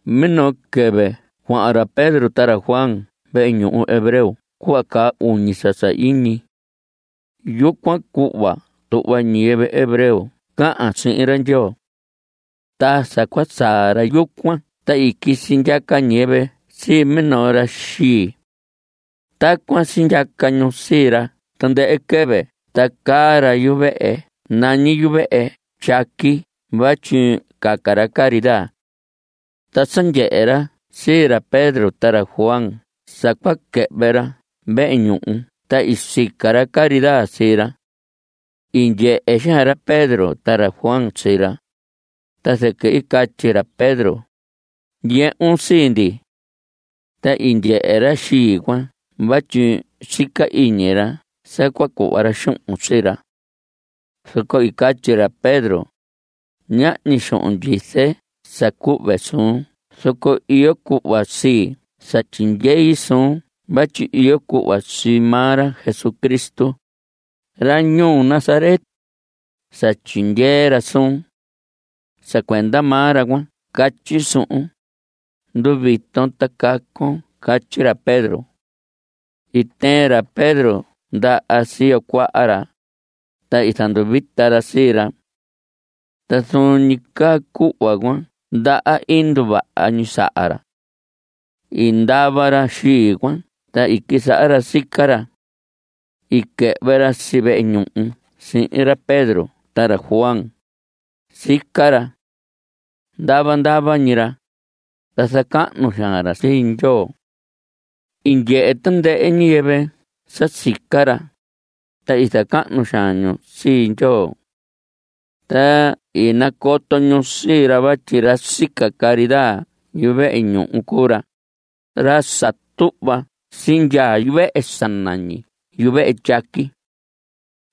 Minoo quɨvɨ cuahan ra Pedro ta ra Juan vehe ñuhu hebreo cuhva caa uñi sa sahiñi. Yucuan cuhva tuhva ñiyɨvɨ hebreo cahan sihin ra Ndyoo. Ta sa cua saa ra yucuan ta i quisi ndyaca ñiyɨvɨ sii minoo ra xii. Tacuan sindyaca ñu sii ra tandɨhɨ quɨvɨ ta caa ra yuvehe nañi yuvehe tyaqui vatyi caca ra caridad. Ta sa ndyehe ra sii ra Pedro ta ra Juan sa cua quɨhvɨ ra vehe ñuhu ta i sica ra caridad sii ra. I ndyehe xaan ra Pedro ta ra Juan sii ra, ta zɨquɨ i catyi ra Pedro: Ndyehun sii ndi. Ta i ndyehe ra xii cuan vatyi sica iñi ra sa cua cuhva ra xuhun sii ra. Zoco i catyi ra Pedro: Ñahñi xuhun ndyize sa cuhve suun zoco iyo cuhva sii sa tyindyei suun vatyi iyo cuhva sii maa ra Jesucristo, ra ñuu Nazaret, sa tyindyee ra suun. Sa cuenda maa ra cuan catyi suhun: Nduviton ta cacon. Catyi ra Pedro. I tɨɨn ra Pedro ndaha siyo cuaha ra, ta i zanduvita ra sii ra. Ta zuun ñi caa cuhva cuan ndaha i nduvaha ñi saha ra. I ndava ra xii cuan ta i quisaha ra sica ra. I quɨhvɨ ra si vehe ñuhu sihin ra Pedro ta ra Juan. Sica ra. Ndava ndava ñi ra, ta zacahnu xaan ra sii Ndyoo. I ndyehe tandɨhɨ ñiyɨvɨ sa sica ra, ta i zacahnu xaan ñu sii Ndyoo. Ta i nacoto ñu sii ra vatyi ra sica caridad yuvehe ñuhu cuu ra, ra sa tuhva sindyaa yuvehe sa nañi yuvehe tyaqui.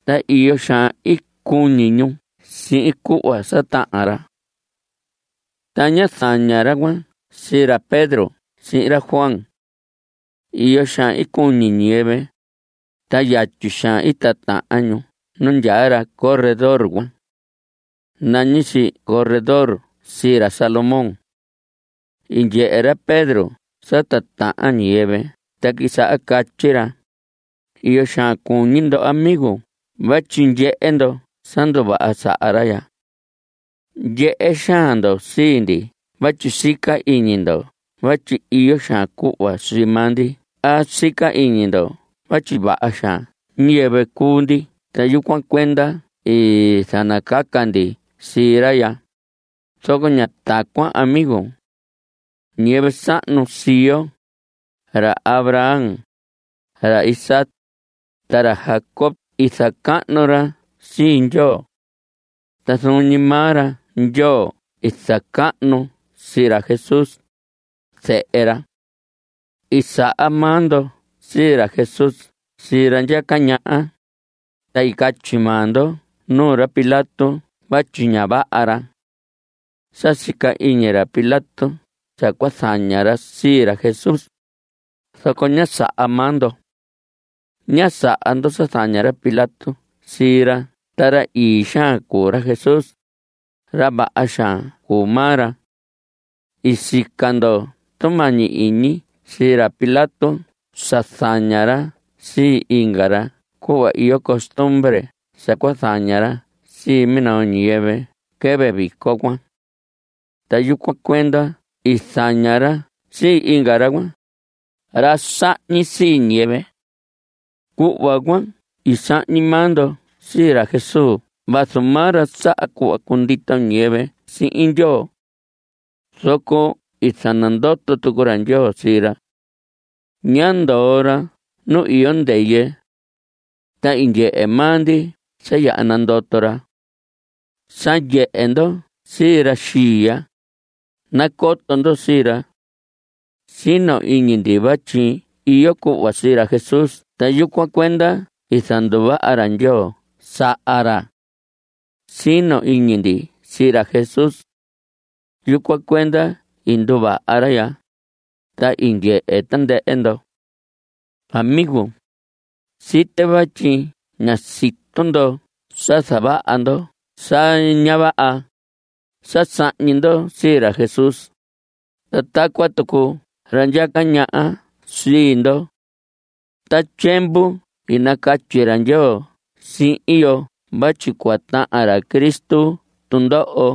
Ta iyo xaan i cuñi ñu sihin cuhva sa tahan ra. Ta ñá zaña ra cuan sii ra Pedro sihin ra Juan. Iyo xaan i cuñi ñiyɨvɨ, ta yatyi xaan i titahan ñu nu ndyaa ra corredor cuan. Nañi si corredor sii ra Salomón. I ndyehe ra Pedro sa titahan ñiyɨvɨ ta i quisaha catyi ra: Iyo xaan cuñi ndo amigo vatyi ndyehe ndo sa nduvaha saha ra ya. Ndyehe xaan ndo sii ndi vatyi sica iñi ndo vatyi iyo xaan cuhva sii maa ndi a sica iñi ndo vatyi vaha xaan ñiyɨvɨ cuu ndi ta yucuan cuenda i zanacaca ndi sii ra ya. Zoco ña tacuan amigo. Ñiyɨvɨ sahnu sii yo, ra Abraham, ra Isaac, ta ra Jacob i zacahnu ra sii Ndyoo. Ta zuun ñi maa ra Ndyoo i zacahnu sii ra Jesús, zehe ra. (I saha maa ndo sii ra Jesús sii ra ndyaca ñaha) ta i catyi maa ndo nuu ra Pilato vatyi ña vaha ra. Sa sica iñi ra Pilato sa cua zaña ra sii ra Jesús, zoco ñá saha maa ndo. Ñá saha ndo sa zaña ra Pilato sii ra ta ra ii xaan cuu ra Jesús. Ra vaha xaan cuu maa ra. I sica ndo tumañi iñi sii ra Pilato sa zaña ra sii inga ra cuhva iyo costumbre sa cua zaña ra sii minoo ñiyɨvɨ quɨvɨ vico cuan. Ta yucuan cuenda i zaña ra sii inga ra cuan, ra sahñi sii ñiyɨvɨ. Cuhva cuan i sahñi maa ndo sii ra Jesús vazu maa ra saha cuhva cundito ñiyɨvɨ sihin Ndyoo. Zoco i zanandoto tucu ra Ndyoo sii ra. Ñá ndoo ra nu iyo ndɨyɨ. Ta i ndyehe maa ndi sa yaha nandoto ra. Sa ndyehe ndo sii ra xii ya, nacoto ndo sii ra. Sino iñi ndi vatyi iyo cuhva sii ra Jesús ta yucuan cuenda i zanduvaha ra Ndyoo saha ra. Sino iñi ndi sii ra Jesús. Yucuan cuenda i nduvaha ra ya, ta i ndyehe tandɨhɨ ndo. Amigo. Site vatyi ña sito ndo sa zavaha ndo sa ña vaha (sa sahñi ndo sii ra Jesús) ta tacuan tucu ra ndyaca ñaha sii ndo. Ta tyiemvu i nacatyi ra Ndyoo sihin yo vatyi cua tahan ra Cristo tundoho.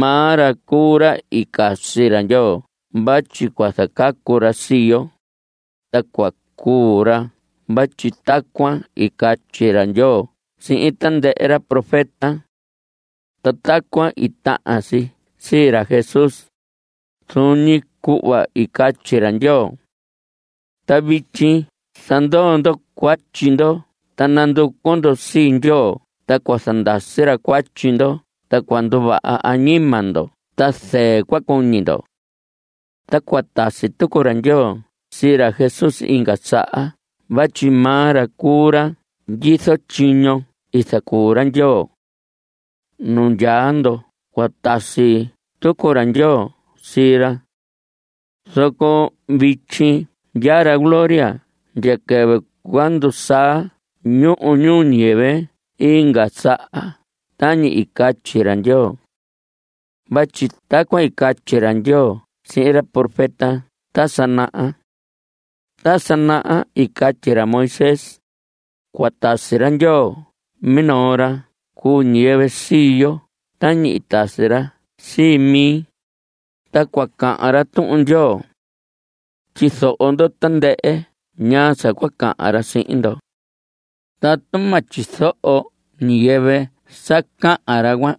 Maa ra cuu ra i casi ra Ndyoo vatyi cua zacacu ra sii yo, ta cua cuu ra vatyi tacuan i catyi ra Ndyoo sihin tandɨhɨ ra profeta. Ta tacuan i tahan si sii ra Jesús, zuun ñi cuhva i catyi ra Ndyoo. Ta vityi zandoo ndo cuatyi ndo ta nanducu ndo sii Ndyoo ta cua zandasi ra cuatyi ndo ta cua nduvaha añima ndo ta zɨɨ cua cuñi ndo. Ta cua tasi tucu ra Ndyoo sii ra Jesús inga saha vatyi maa ra cuu ra ndyizo tyiño i zacuu ra Ndyoo. Nu ndyaa ndo cua tasi tucu ra Ndyoo sii ra. Zoco vityi ndyaa ra gloria ndya quɨvɨ cua ndusaa ñuhu ñuu ñiyɨvɨ inga saha tañi i catyi ra Ndyoo. Vatyi tacuan i catyi ra Ndyoo sihin ra profeta ta sa naha. Ta sa naha i catyi ra Moisés: “Cua tasi ra Ndyoo minoo ra cuu ñiyɨvɨ sii yo tañi i tasi ra sii mi, ta cua cahan ra Tuhun Ndyoo. Tyizoho ndo tandɨhɨ ñaa sa cua cahan ra sihin ndo. Tatu ma tyizoho ñiyɨvɨ sa cahan ra cuan,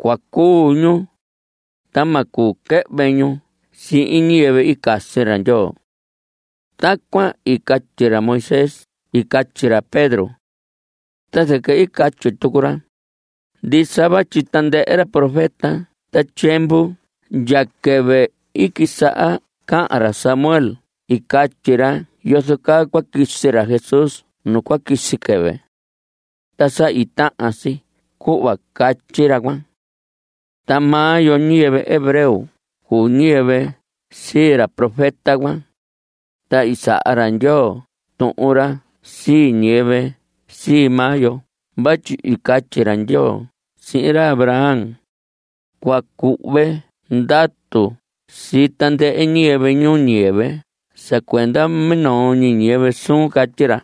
cua cuu ñu, ta ma cuu quɨhvɨ ñu sihin ñiyɨvɨ i casi ra Ndyoo.” Tacuan i catyi ra Moisés i catyi ra Pedro. Ta zɨquɨ i catyi tucu ra: Ndisa vatyi tandɨhɨ ra profeta ta tyiemvu ndya quɨvɨ i quisaha cahan ra Samuel i catyi ra yozo caa cua quisi ra Jesús nu cua quisi quɨvɨ. Ta sa i tahan si cuhva catyi ra cuan. Ta maa yo ñiyɨvɨ hebreo cuu ñiyɨvɨ sii ra profeta cuan, ta i saha ra Ndyoo tuhun ra sii ñiyɨvɨ sii maa yo vatyi i catyi ra Ndyoo sihin ra Abraham: “Cua cuhve ndatu sii tandɨhɨ ñiyɨvɨ ñuu ñiyɨvɨ sa cuenda minoo ñiyɨvɨ suun.” Catyi ra.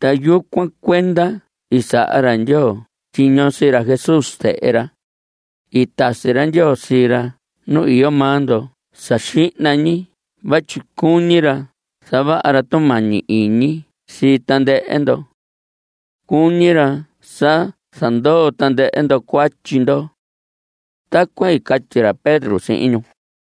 Ta yucuan cuenda i saha ra Ndyoo tyiño sii ra Jesús, zehe ra. I tasi ra Ndyoo sii ra nu iyo maa ndo sa xihna ñi vatyi cuñi ra zavaha ra tumañi iñi sii tandɨhɨ ndo. Cuñi ra sa zandoo tandɨhɨ ndo cuatyi ndo. Tacuan i catyi ra Pedro sihin ñu.